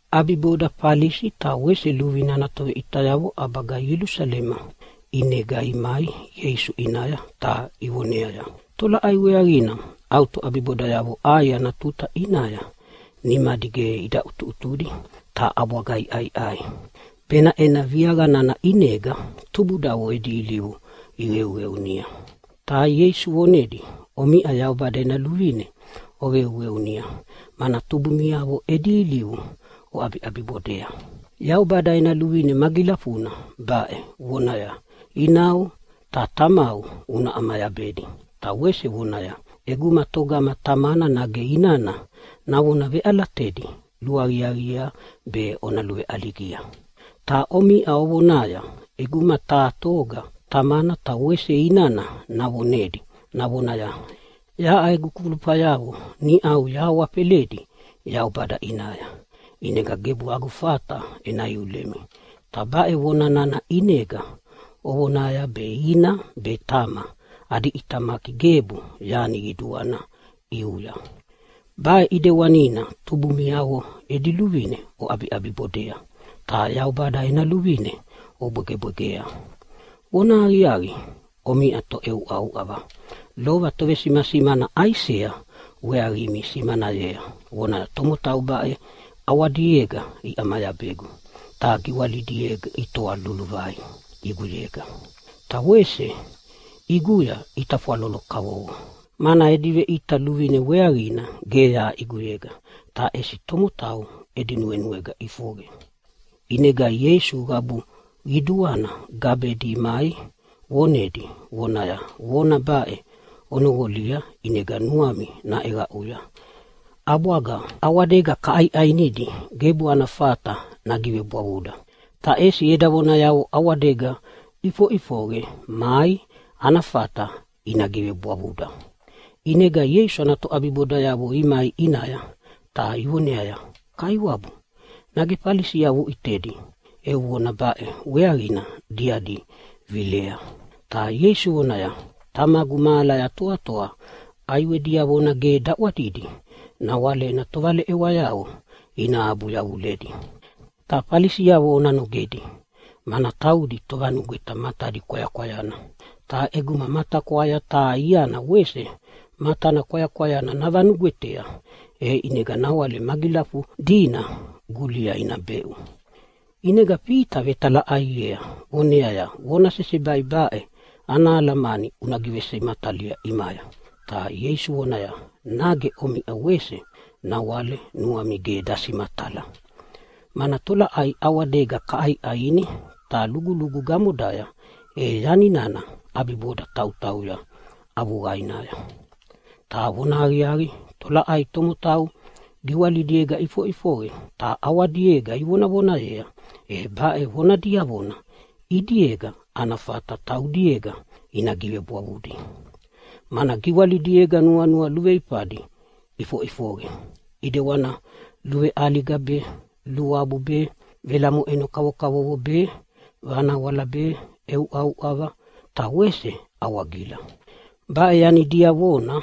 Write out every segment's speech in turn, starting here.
ʼAbibodanaya Falisi ta wese luvine ana toveʼitayavo ʼabaga Ielusalema ʼinega imai Ieisu ʼinaya ta ivoneaya, “Tolaʼai weaqina au toʼabibodayavo ʼai ana tuta ʼinaya nimadi ge ida ʼutuʼutudi ta ʼabwaga iʼaiʼai, benaʼena viaqa nana ʼinega tubudavo edi ilivu iqeuqeunia?” Ta Ieisu vonedia, “Omiʼa Yaubada ena luvine oqeuqeunia, mana tubumiavo edi ilivu oʼabiʼabibodea. Yaubada ena luvine magilafuna baʼe vonaya, ‘Inau ta tamau una ʼamayabedi’, ta wese vonaya, ‘ʼEguma togama tamana nage inana navona veʼalatedi luaqiaqiea be ona luveʼaligia’. “Ta omiʼa ovonaya ʼeguma taha toga tamana ta wese inana navonedi navonaya, ‘Yaʼa egu kulufayavo niʼau yahawafeledi Yaubada ʼinaya, ʼinega gebu agu fata ena iulemi’. Ta baʼe vona nana ʼinega ovonaya be ina be tama adi ʼitamaki gebu yani qiduana ʼiuya. Baʼe ʼidewanina tubumiavo edi luvine oʼabibodea, ta Yaubada ena luvine obwegebwegea. Vonahaqiaqi, omiʼa toʼeuʼauʼava! Lova tovesimasimana Aisea weaqimi simanayea, vonaya, ‘Tomotau baʼe ʼawadiega iʼamayabegu ta giwalidiega itoa luluvai ʼiguyega. Ta wese ʼiguya itafwalolo kavovo, mana edi veʼita luvine weaqina ge yaʼa ʼiguyega ta ʼesi tomotau edi nuenuega ʼifoqe.’” ʼInega Ieisu qabu qiduana gabedi imai vonedi vonaya, “Vona baʼe ona noqolia ʼinega nuami naʼeqaʼuya! ʼAbwaga ʼawadega kaʼaiʼainidi gebu ana fata nagivebwavuda, ta ʼesi eda vonayavo ʼawadega iʼifoqe mai ana fata ina givebwavuda.” ʼInega Ieisu ana toʼabibodayavo imai ʼinaya ta ivoneaya, “Kaiwabu, nage Falisiavo uʼitedi eu vona baʼe weaqina diadi vilea?” Ta Ieisu vonaya, “Tamagu mahalaya toatoa ʼaiwe diavona ge daʼwadidi nawale ena tovaleʼewayavo ina abu yavuledi. Ta Falisiavo ona nogedi, mana taudi tovanugweta matadi kwayakwayana. Ta ʼeguma matakwaya taha iana wese matana kwayakwayana navanugwetea e ʼinega nawale magilafudina gulia ina beʼu.” ʼInega Fita vetalaʼaiea vonaya, “Vona sesebai baʼe ana alamani una givesimatalia ʼimaya.” Ta Ieisu vonaya, “Nage omiʼa wese nawale nuami ge dasimatala? Mana tolaʼai ʼawadega kaʼaiʼaini ta lugulugu gamodaya e yani nana ʼabiboda tautauya avuqainaya. Ta vonahaqiaqi, tolaʼai tomotau giwalidiega ʼifoʼifoqe ta ʼawadiega ivonavonayea, e baʼe vona diavona ʼidiega ana fata taudiega ina givebwavudi. Mana giwalidiega nuanua luveifadi ʼifoʼifoqe ʼidewana luveʼaliga be, luabu be, velamoʼeno kavokavovo be, vanawala be, ʼeuʼauʼava ta wese awagila. Baʼe yani diavona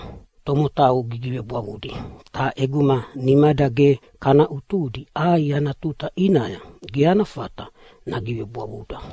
tomotau gigivebwavudi, ta ʼeguma nimada ge kana ʼutudi ʼai ana tuta ʼinaya ge ana fata nagivebwavuda.”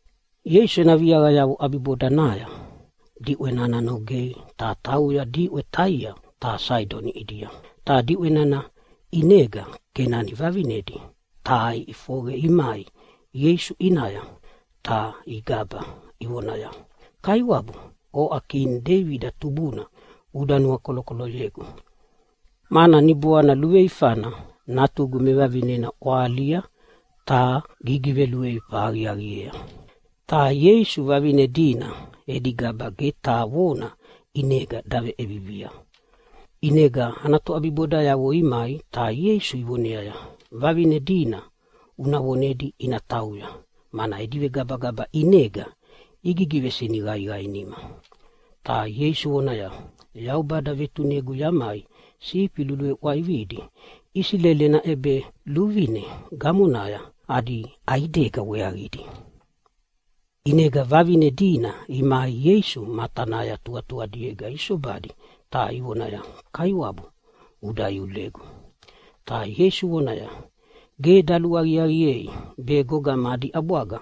Ieisu ena viaqayavo ʼabibodanaya diʼwe nana nogea ta tauya diʼwe Taia ta Saidoni ʼidia. Ta diʼwe nana ʼinega Kenani vavinedi taha iʼifoqe imai Ieisu ʼinaya ta igaba ivonaya, “Kaiwabu, oʼa kini Deibida tubuna uda nuakolokoloyegu, mana niboana luveifana natugu mevavinena ʼwahalia ta gigiveluveifa aqiaqiea.” Ta Ieisu vavine dina edi gaba ge taha vona ʼinega daveʼevivia. ʼInega ana toʼabibodayavo imai ta Ieisu ivoneaya, “Vavine dina una vonedi ina tauya, mana edi vegabagaba ʼinega igivesiniqaiqaiema.” Ta Ieisu vonaya, “Yaubada vetunegu yamai sifi luluveʼwaividi Isileli ena ʼebeluvine gamonaya adi ʼaidega weaqidi.” ʼInega vavine dina imai Ieisu matanaya tuqatuqadiega isobadi ta ivonaya, “Kaiwabu uda iulegu!” Ta Ieisu vonaya, “Ge daluaqiaqiei be gogama adi ʼabwaga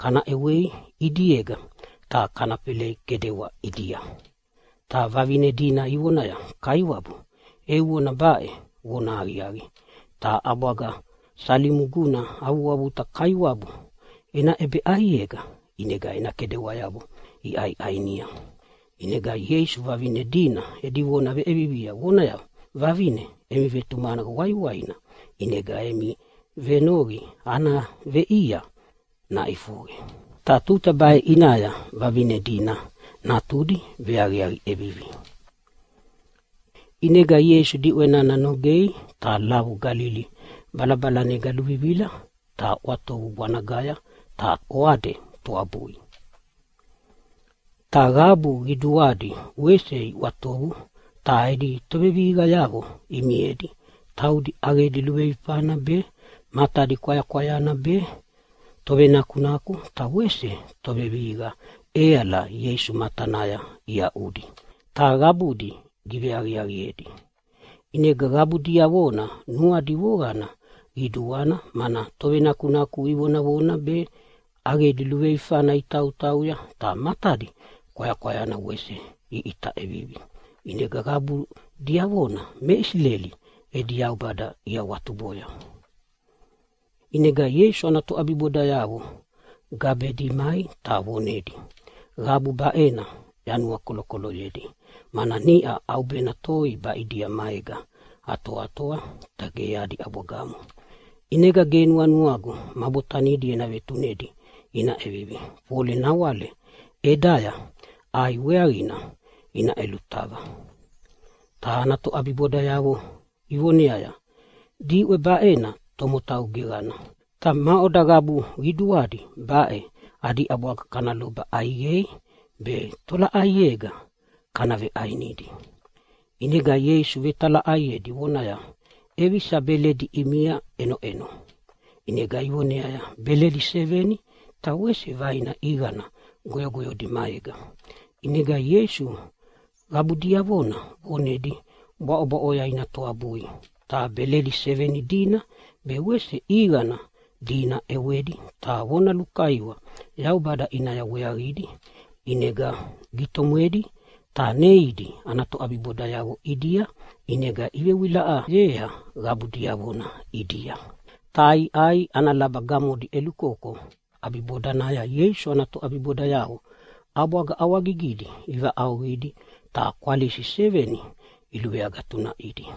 kana ʼewei ʼidiega ta kana felei kedewa ʼidia.” Ta vavine dina ivonaya, “Kaiwabu, eu vona baʼe vonahaqiaqi, ta ʼabwaga salimuguna avuavuta kaiwabu ena ʼebeʼaiega ʼinega ena kedewayavo iʼaiʼainia?” ʼInega Ieisu vavine dina edi vona veʼevivia vonaya, “Vavine, emi vetumaqana waiwaina, ʼinega emi venoqi ana veʼia naʼifoqe.” Ta tuta baʼe ʼinaya vavine dina natudi veaqiaqi ʼevivi. ʼInega Ieisu diʼwe nana nogei ta lavu Galili balabalanega luvivila ta ʼwatovu bwanagaya ta oade toabui. Ta qabu qiduadi wese iʼwatovu ta edi tovevihiqayavo imiedi taudi ʼaqedi luveifana be, matadi kwayakwayana be, tovenakunaku ta wese tovevihiqa ʼeala Ieisu matanaya iaʼudi. Ta qabudi giveaqiaqiedi. ʼInega qabu diavona nuadi voqana qiduana, mana tovenakunaku ivonavona be, ʼaqedi luveifana itautauya ta matadi kwayakwayana wese iʼita ʼevivi. ʼInega qabu diavona me Isileli edi Yaubada iawatuboya. ʼInega Ieisu ana toʼabibodayavo gabedi imai ta vonedia, “Qabu baʼena yanuakolokoloyedi mana niʼa ʼaubena toi baʼidia maega atoatoa ta ge adi ʼabwagamo. ʼInega ge nuanuagu ma botanidi ena vetunedi ina ʼevivi fole nawale ʼedaya ʼai weaqina ina ʼelutava.” Ta ana toʼabibodayavo ivoneaya, “Diʼwe baʼena tomotau geqana, ta maʼoda qabu qiduadi baʼe adi ʼabwaga kana loba ʼaiqei, be tolaʼaiega kana veʼainidi?” ʼInega Ieisu vetalaʼaiedi vonaya, “ʼEvisa beledi ʼimia ʼenoʼeno?” ʼInega ivoneaya, “Beledi seveni ta wese vaina ʼiqana goyogoyodi maega.” ʼInega Ieisu qabu diavona vonedi bwaʼobwaʼoya ina toabui. Ta beledi seveni dina be wese ʼiqana dina ʼewedi ta vona lukaiwa Yaubada ʼinaya weaqidi. ʼInega gitomwedi ta neidi ana toʼabibodayavo ʼidia, ʼinega ivewilaʼayea qabu diavona ʼidia, ta iʼai ana laba gamodi ʼelukoko. ʼAbibodanaya Ieisu ana toʼabibodayavo ʼabwaga ʼawagigidi ivaʼauqidi, ta kwalisi seveni iluveagatunaʼidi.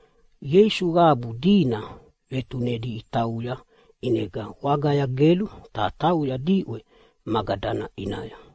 Ieisu qabu dina vetunedi itauya, ʼinega wagaya gelu ta tauya diʼwe Magadana ʼinaya.